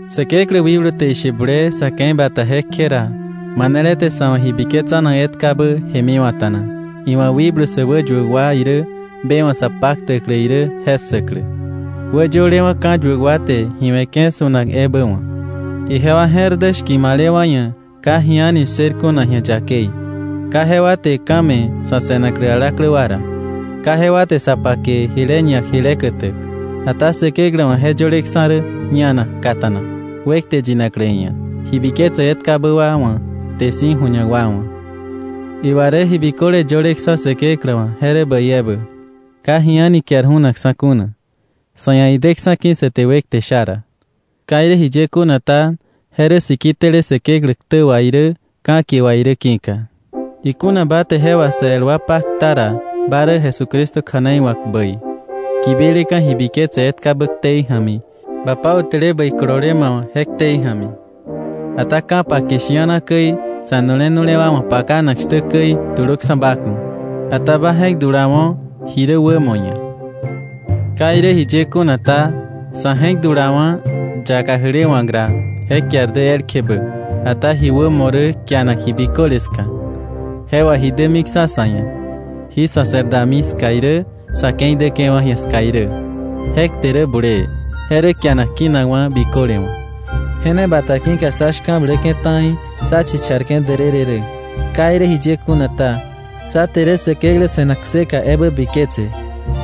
Säkeklä wikblu te ishe bulee sa̱ ke̱i bata je kje ra, manele te sa̱ wa̱ ji biketsanak etkabä jemiwa̱ta̱na, iwa̱ wikblu sä wäyuäk wa irä be wa̱ sa paktäklä irä je ssäklä, wäyölewa̱ ka̱yuäk wa te ji we̱ke̱ su̱nak ebä wa̱. Ijewa je̱r dä shki̱malewa̱ ia̱ ka ji a̱ni ssër kuna ji̱a yakei. Ka jewa te ka̱ me̱ sa̱ se̱naklä alaklä wa ra, ka jewa te sa pake jile ñak jile kätäk. Ata Säkeklä wa̱ je yöleksa̱ rä ñanak kata̱nak, wekte yinaklä iia̱, ji biketsäk etkabä wa wa̱, kte si̱ ju̱ñak wa wa̱. Iwa rä ji biköle yöleksa̱ Säkeklä wa̱, je rä bäi ebä. Ka ji a̱ni kiar ju̱nakksa̱ kuna, sa̱ ia̱ ideksa̱ ki̱ sa te wekte sha ra. Ka irä jiye kuna ta, je rä siki tele Säkeklä ktä wà irä, ka̱kie wà irä ki̱ka. Ikuna ba te je wà sä el wa pakta ra, ba rä Jesucristo kja̱nei wa̱k bäi, kibileka̱ ji biketse etkabä ktei ja̱mi, ba pautäle bäi kolole ma wa̱ je ktei ja̱mi. Ata ka̱pake shi̱ana käi, sa̱nu̱le nu̱le wa wa̱ pakanak shtä käi, tulöksa̱ ba ku̱. Ata ba je̱k dulawo̱ ji rä wämo ia̱. Ka irä jiye kuna ta, sa̱ je̱k dulawa̱ yaka jälewa̱k ra, je kiar dä elkje bä. Ata ji wämo rä kianak ji biköle ska. Je wà ji dämiksa̱ sa̱ ia̱, jí sa̱ se̱r dami ska irä, sa̱ ke̱i däke̱wa̱ ji̱a ska irä. Je kte rä bulee, je rä kianak kinakwa̱ biköle wa̱. Je ne bata ki̱ka sá shka̱bläke̱ ta̱i sá chicharke̱ därërë rä. Ka irä jiye kuna ta, sá je̱r bläke̱ Säkeklä se̱nak kseka ja̱mi.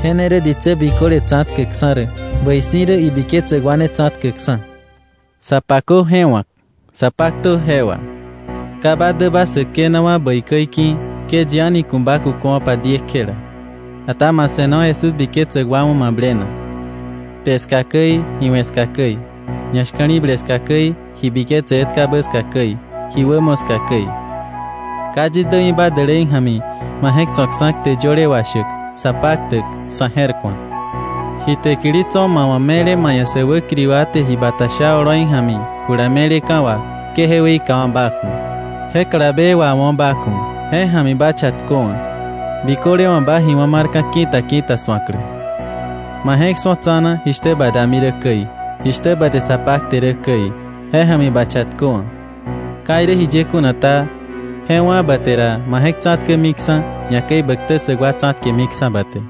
Je ne rä ditsä biköle tsa̱tkäkksa̱ rä, bäi si̱ rä ibiketsäk wa ne tsa̱tkäkksa̱. Sa pakö je wa̱k, sa paktö je wà. Ka ba däba säkenawa̱ bäi käi ki̱, ke yi a̱ni ku̱ ba kuköwa̱pa diekjela, ata ma se̱no Jesús biketsäk wa wa̱ mablenak; kte ska käi, ji we̱ ska käi, ñashka̱li̱ble ska käi, ji biketse etkabä ska käi, ji wämo ska käi. Ka yis dämiba dälei ja̱mi, ma je̱k tso̱ksa̱ kte yöle washäk, sa paktäk, sa̱ je̱rku̱ak. Ji täkili tso̱ ma wa̱, me̱le ma ia̱ sä wäkiri wa te ji bata sha oloi ja̱mi, jula me̱leka̱ wà, ke je weikawa̱ ba ku̱. Je kalabe wawo̱ ba ku̱, je ja̱mi ba chatköwa̱, biköle wa̱ ba ji wá̱ marka̱ ki̱ta ki̱ta su̱aklä. Ma je̱k su̱o tsa̱na jishtä ba dami rä käi, jishtä ba te sa pakte rä käi, je ja̱mi ba chatköwa̱. Ka irä jiye kuna ta, je wá̱ ba te ra, ma je̱k tsa̱tkämiksa̱, ñakäi bä ktä ssäk wa tsa̱tkemiksa̱ ba te.